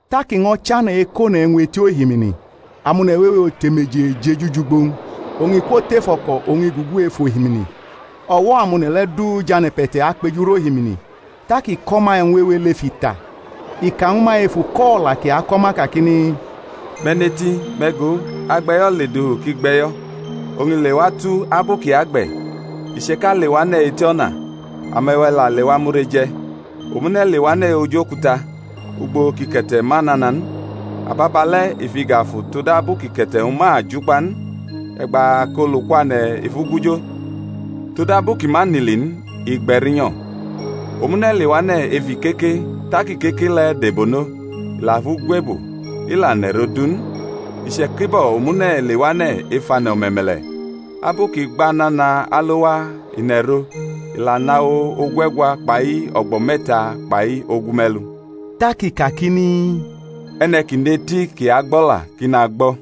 Tak i ño̩ chane̩ ekʼone̩ e̩wñ eti ohimini. Amone̩ wewe otemeje jeju wʼugbo-wñ; oñ i kwotʼef o̩ko̩ oñ i gugu ej ohimini; o̩wo̩ amone̩ le̩ du jʼane̩pe̩te̩ akpejurʼohimini. Tak i ko̩ ma e̩wñ wewe lef ita, i ka ñwu ma ef uko̩-o̩la kʼi ako̩ ma kakini, Me̩ neti: me̩ go, agbe̩yo̩ ledufu kʼi gbʼe̩yo̩. Oñ ileatu abu kʼi agbe̩, iche̩ka lewane̩ eti o̩na, ame̩we̩ la lewa mure je̩. Omune̩ lewane̩ oj okuta ugbo kʼike̩te̩ ma nana n, ababale̩ i fʼiga fu todabu kʼike̩te̩-wñ ma jukpa n; e̩gba kʼolu kwane̩ i fʼu gujo; todabu kʼi ma nʼili n, igbe̩rinyo̩. Omune̩ lewane̩ ef ikeke tak ikeke le̩ debonʼo, i la fʼu gwebo, i la nʼe̩ro̩ du n. Iche̩kibo̩ omune̩ lewane̩ ef ane̩ o̩me̩me̩le̩; abu kʼi gba nana alo waa i nʼe̩ro, i la nʼawo ogue̩gwa kpai o̩gbo̩ me̩ta kpai ogume̩lu. Tak i kakini, E̩ne̩ ki nʼeti kʼi agbo̩la, ki nagbo̩.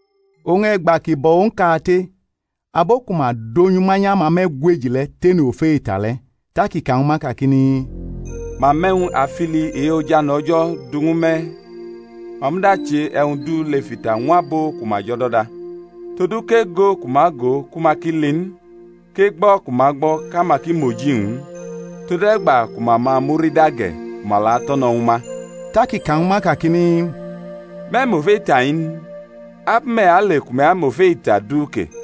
Oñ e̩gba ki bo̩ owñ kate, abo ku ma donyʼu manyʼamame̩gweji le̩ tene ofe ita le̩. Tak i ka ñwu ma kakini, Ma mʼe̩wñ afili e-ojane̩ O̩jo̩ du ñwu me̩;, ma muda che e̩wñ du lef ita ñw abo ku ma jʼo̩do̩da; todu kʼego ku ma go, ku ma ki li n; kʼegbo̩ ku ma gbo̩, kʼama ki mʼoji-wñ n; tode̩gba ku ma ma murida ge̩, ku ma la to̩no̩ ñwu ma. Tak i ka ñwu ma kakini, Me̩ mʼo̩la ita-i n? Abu me̩ ale ku me̩ amʼofe ita du ke?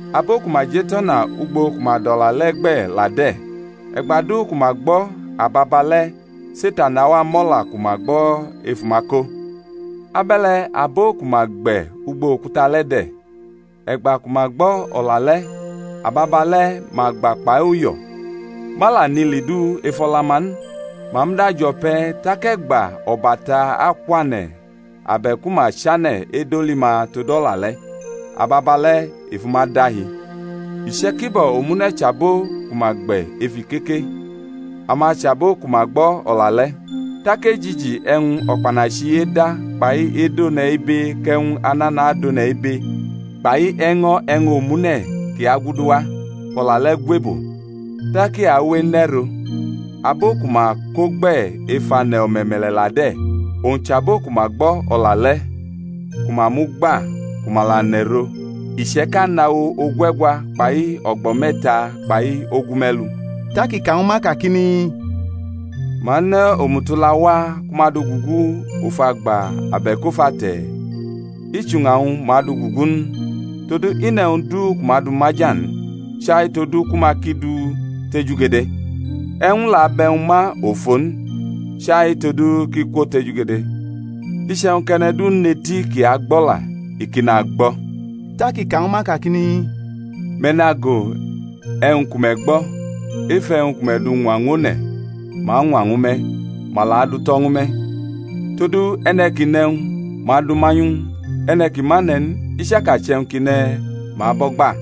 Abo ku ma jʼetʼo̩na ugbo ku ma dʼO̩la le̩ gbe̩ la de̩, e̩gba du ku ma gbo̩, ababale̩ Setan awa mʼO̩la ku ma gbe̩ ef uma ko. Abe̩le̩ abo ku ma gbe̩ ugbo okuta le̩ de̩, e̩gba ku ma gbo̩ O̩la le̩, ababale̩ ma gba kpai uyo̩; ma la nʼili du ef o̩la-ma n, ma muda jo̩ pe̩; tak e̩gba o̩bata akwane̩ abe̩ku ma chane̩ edoli ma tod O̩la le̩, ababale̩ i fu ma dahi. Iche̩kibo̩ omune̩ chʼabo ku ma gbe̩ ef ikeke; ama chʼabo ku ma gbo̩ O̩la le̩; tak ejiji e̩wñ o̩kpanachi-i eda kpai edʼone̩ ibe kʼe̩wñ anana adʼone̩ ibe, kpai e̩ño̩ e̩wñ omune̩ ki aguduwa, fʼO̩la le̩ gwebo, tak i awe enʼero̩. Abo ku ma ko gbe̩ ef ane̩ o̩me̩me̩le̩ la de̩, owñ chʼabo ku ma gbo̩ O̩la le̩, ku ma mʼu gba, ku ma la nʼe̩ro, iche̩ka nʼawo o̩gue̩gwa kpai o̩gbo̩ me̩ta kpai ogume̩lu. Tak i ka ñwu ma kakini, Ma ne̩ omutala wa ku ma dʼu gugu of agba abe̩k of ate̩? I chʼuña-wñ ma dʼu gugu n? Todu i nʼe̩wñ du ku ma du maja n chai todu ku ma ki du tejugede; e̩wñ la bʼe̩wñ ma ofo n, chai todu kʼi kwotejugede. Iche̩wñ kʼe̩ne̩ du nʼeti kʼi agbo̩la, i ki nagbo̩. Tak i ka ñwu ma, kakini, Me̩ nago e̩wñ ku me̩ gbo̩; ef e̩wñ ku me̩ du ñwa ñwʼone̩, ma añwa ñwu me̩; ma la adutʼo̩ ñwu me̩. Todu e̩ne̩ ki nʼe̩wñ, ma adʼu manyʼu ñw u; e̩ne̩ ki ma ne̩ n, I chaka chʼe̩wñ kʼi ne̩, ma abʼo̩ gba.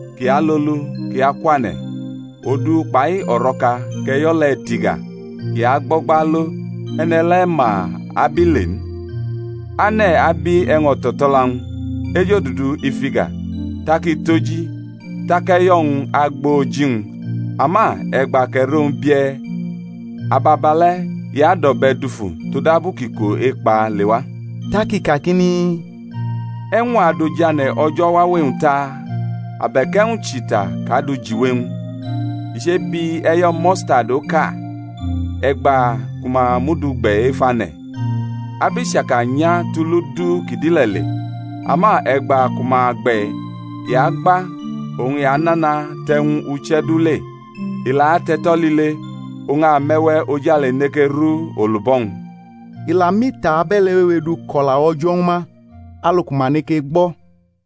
kʼi alolu, kʼi akwane̩, odu kpai o̩ro̩ka, kʼe̩yo̩ le̩ tiga, kʼi agbo̩gba alo, e̩ne̩ le̩ ma abile n. Ane̩ abi e̩wñ o̩to̩to̩la-wñ, ejodudu i fʼiga, tak i toji, tak e̩yo̩-wñ agbo oji-wñ. Ama e̩gba kʼe̩ro-wñ bie̩, ababale̩ i adʼo̩be̩ dufu, todabu kʼiko-e̩kpa lewa. Tak i kakini, E̩wñ a du ojane̩ O̩jo̩ wawe-wñ ta? Abe̩k e̩wñ chʼita kʼa du jiwe-wñ? I chebi e̩yo̩ mustadi oka, e̩gba ku ma mʼu du gbe̩ ef ane̩, abʼi chaka nya tʼulu du ki dʼile̩ le, ama e̩gba ku ma gbe̩, i agba oñ i anana tʼe̩wñ-uche̩ du le, i la atʼe̩to̩ lile; oñ ame̩we̩ ojale neke ru olubo̩-wñ. I la mʼita abe̩le̩ wewe du kʼO̩la O̩jo̩ ñwu ma, alu ku ma neke gbo̩.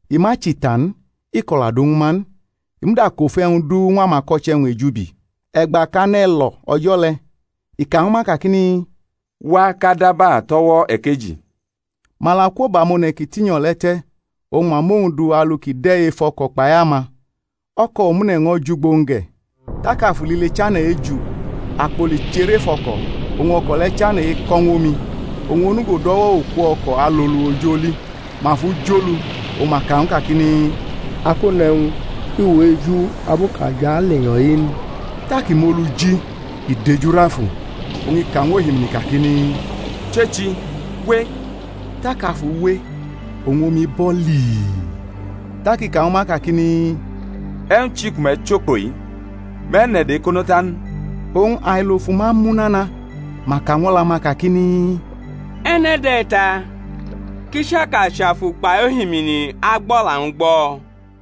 I ma chʼita n, i ko̩la du ñwu ma n; i muda kʼofe e̩wñ du ñw amako̩che̩-wñ ejubi. E̩gba kʼane̩ lo̩ o̩jo̩ le̩, i ka ñwu ma, kakini, Wa kʼa daba tʼo̩wo̩ ekeji. Ma la kwo bʼamone̩ ki tinyo̩ le̩ te̩ oñ ma mʼowñ du alu kʼi de̩ ef o̩ko̩ kpai ama. O̩ko̩ omune̩ ño̩ jʼugbo-wñ ge̩. Tak afu lile chane̩ eju, akpoli cherʼef o̩ko̩, oñ o̩ko̩ le̩ chane̩ eko̩ ñw omi. Owñ onugo dʼo̩wo̩ oku o̩ko̩ alolu oj aloji; ma fʼu jolu, oñ ma ka ñw u kakini, Akone̩wñ, i awʼe̩ eju abu kʼa jʼalenyo̩-i n? Tak i mʼolu ji, i dejurʼafu, oñ i ka ñw ohimini, kakini, Chechi, we. Tak afu we oñ omi bo̩ lii. Tak i ka ñwu ma, kakini, E̩wñ chi ku me̩ chʼokpo-i? Me̩ nʼe̩do̩ ekono ta n? Oñ ailo fu ma mu nana, ma ka ñw o̩la-ma kakini, E̩ne̩ de̩-i ta? kʼichaka chʼafu kpai ohimini agbʼo̩la-wñ gbo̩?